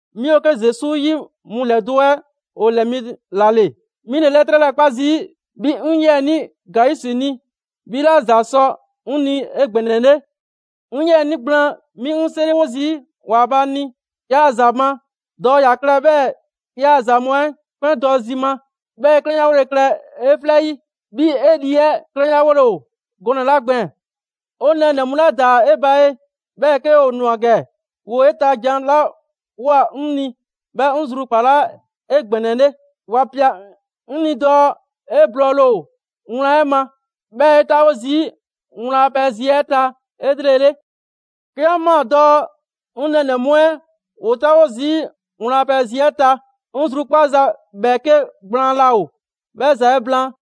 'Mi ‑o 'ke Zesu 'yi mu ‑lɛdo' 'ɛ ‑o ‑lɛɛ mi ‑la ‑le. 'Mi ‑le 'lɛtrɛ 'lɛɛ‑ 'kpa zii' 'bhi 'ŋ 'yiɛnii Gayusi ni, 'bhi ‑la ‑za sɔ 'ŋ ni 'egbɛnɛle. 'Ŋ 'yiɛnii gblaan, 'mi 'ŋ 'seriwo zii' ‑Waanbhaa' ni 'yaa‑ ‑za ma dɔɔ ‑ya klɛ 'bhɛɛ‑ 'yaa‑ ‑za mu 'ɛ 'kpɛn dɔ zima; 'bhɛɛ‑ 'e 'klɛnyawole klɛ 'e 'flɛ 'yi, 'bhii‑ 'e lii 'ɛ 'klɛnyawole ‑o gɔnɛ‑ 'la gbɛɛn‑. 'O nɛɛnɛ‑ mu 'la ‑daa 'e ba ye, 'bhɛɛ‑ 'ke ‑o ‑nwa ‑gɛ, ‑woo 'e ta jan 'la ꞊woa 'ŋ ni, 'bhɛ 'ŋ zrukpalaa 'egbɛnɛle. ‑Wa ‑pia 'ŋ 'ni dɔɔ 'e blɔɔle ‑o wlan 'ɛ ma, 'bhɛɛ‑ 'e 'taawo zii' wlan a pɛ zi 'ɛ ta 'elrele. 'Ke 'an ꞊maa dɔɔ 'ŋ 'nɛ mu 'ɛ ‑woo 'taawo zii' wlan a pɛ zi 'ɛ ta, 'ŋ zrukpaaza ‑bhɛɛke' gblaan 'laa ‑o 'bhɛ ‑za 'ɛ blaan.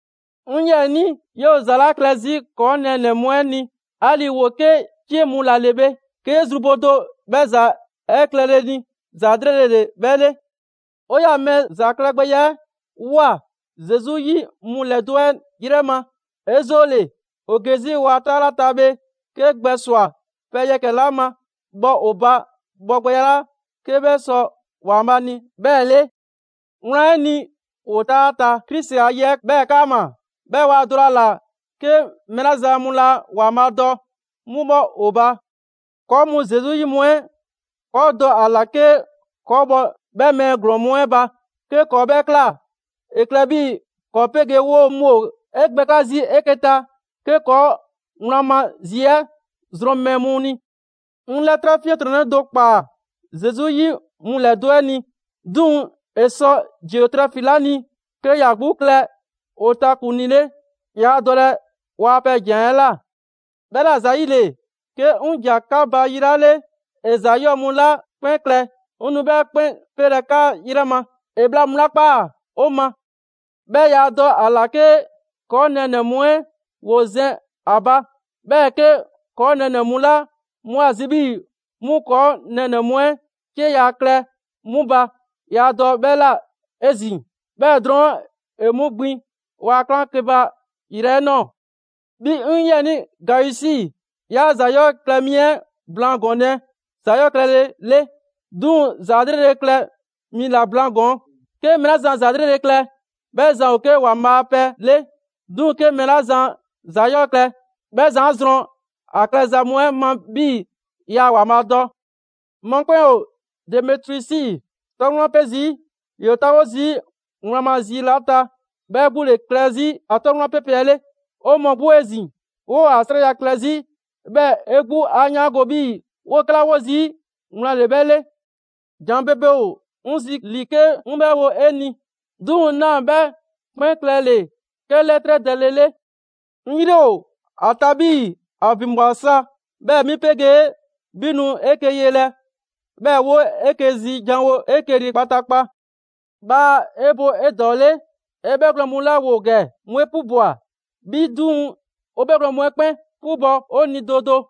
'Ŋ 'yiɛnii, 'yoo‑ ‑za 'la klɛ 'zi ‑kɔɔ' nɛɛnɛ‑ mu 'ɛ ni, 'ali‑ ‑woo 'ke 'cie mu 'la 'le bhe, 'ke 'yee zru bo do 'bhɛ ‑za 'ɛ klɛle ni, ‑za 'lrele‑ ‑le 'bhɛ 'le. ‑O 'yaa‑ mɛɛ ‑za klɛgbɛya 'ɛ ꞊woa Zesu 'yi mu ‑lɛdo' 'ɛ yrɛ ma. 'E 'zoole‑, ‑o ge 'zi ‑waa' 'taa 'la ta bhe, 'kee gbɛ ‑swa pɛ yɛkɛ‑ 'la ma, bhɔ ‑o ba bhɔgbɛya 'la 'ke 'bhɛ sɔ ‑Waanbhaa' ni 'bhɛɛ‑ 'le. Wlan 'ɛ ni, ‑woo 'taa ta Krisi a ye 'ɛ 'bhɛɛ‑ 'kaama‑, 'bhɛɛ‑ waa dɔlɛ ‑a ‑la 'ke mɛɛ 'la zan mu laa ‑Waanbhaa' dɔ 'mu 'bhɔ ‑o ba. ‑Kɔɔ' mu Zesu 'yi mu 'ɛ, ‑kɔɔ' dɔ ‑a ‑la 'ke ‑kɔɔ' bhɔ 'bhɛ mɛɛ ‑glɔɔn mu 'ɛ ba. 'Ke ‑kɔɔ' 'bhɛ ꞊kla, ‑e klɛ 'bhii‑ ‑kɔɔ' 'pegee 'woo‑ mu ‑o 'e gbɛkla' zii' 'eke‑ ta, 'ke ‑kɔɔ' wlan ma zi 'ɛ zrɔn mɛɛ mu ni. 'Ŋ 'lɛtrɛ 'fiɛntrɔnnɛ do ꞊kpaa Zesu 'yi mu ‑lɛdo' 'ɛ ni. 'Duŋ‑ ‑e sɔ Diotrɛfi 'la ni 'ke ‑ya 'gbu klɛ ‑o ta ‑kuŋlii 'le, yaa dɔlɛ 'waa‑ pɛ ‑jan 'ɛ ꞊la. 'Bhɛla ‑zayile, 'ke 'ŋ ‑ja 'ka ba yi 'la 'le, ‑e ‑za 'yɔɔ‑ mu 'la 'kpɛn klɛ, 'ŋ nu 'bhɛ 'kpɛn 'pelɛ‑ 'ka 'yrɛ ma: ‑e bhla mu 'la 'kpa 'o ma; 'bhɛɛ‑ yaa dɔ ‑a ‑la 'ke ‑kɔɔ' nɛɛnɛ‑ mu 'ɛ ‑woo zɛn ‑a ba. 'Bhɛɛ‑ 'ke ‑kɔɔ' nɛɛnɛ‑ mu 'la 'mu ‑a zi 'bhii‑ 'mu ‑kɔɔ' nɛɛnɛ‑ mu 'ɛ 'cieya‑ klɛ 'mu ba, yaa dɔ 'bhɛ ꞊la 'ezin‑; 'bhɛɛ‑ drɔɔn' ‑e 'mu gbin ‑waa' 'klaŋkeba yrɛ 'ɛ ꞊nɔɔ. 'Bhi 'ŋ 'yiɛnii Gayusi, 'yaa ‑za 'yɔɔ‑ klɛ mi 'ɛ blaan gɔɔnlɛ ‑za 'yɔɔ‑ klɛlele, 'duŋ‑ ‑za 'lrele‑ klɛ mi ‑la blaan ‑gɔɔn. 'Ke mɛɛ 'la zan ‑za 'lrele‑ klɛ, 'bhɛ zan ‑o 'ke ‑Waanbhaa' a pɛ 'le. 'Duŋ‑ 'ke mɛɛ 'la zan ‑za 'yɔɔ‑ klɛ, 'bhɛ zan 'a zrɔn 'a klɛza mu 'ɛ ma 'bhii‑ yaa ‑Waanbhaa' dɔ. Mɔkpɛn' ‑o Demetriusi 'tɔ wlan 'pe 'zi. ‑Yoo 'taawo zii' wlan ma zi 'la ta, 'bhɛ 'gbu ‑le klɛ 'zi ‑a 'tɔ wlan pe pɛ 'ɛ 'le. 'O mɔɔ 'gbu 'ezin‑, 'woo‑ ‑a 'srɛya‑ klɛ 'zi; 'bhɛɛ‑ 'e 'gbu 'a 'yaango‑ 'bhii‑ 'woo‑ 'kɛla 'wo zii' wlan ‑le 'bhɛ 'le. ‑Jan ‑bebe ‑o 'ŋ 'zi ‑li 'ke 'ŋ 'bhɛ wo 'e ni, 'duŋ‑ 'naa 'bhɛ 'kpɛn klɛle‑ 'ke 'lɛtrɛ dɛle 'le. 'Ŋ 'yri ‑o ‑a ta 'bhii‑ ‑a ‑vinbwa sa, 'bhɛɛ‑ 'mi 'pegee 'bhi nu 'eke‑ yelɛ, 'bhɛɛ‑ 'woo 'eke‑ zi janwo 'eke‑ ni kpataakpa. Bhaa 'e bo 'edɔɔle! 'E 'bhɛgwlɛn‑ mu 'la ‑woo ‑gɛ, 'mu 'e 'pubwa‑. 'Bhi 'duŋ‑, 'o 'bhɛgwlɛn‑ mu 'ɛ 'kpɛn 'pubɔ‑ 'o ni do do.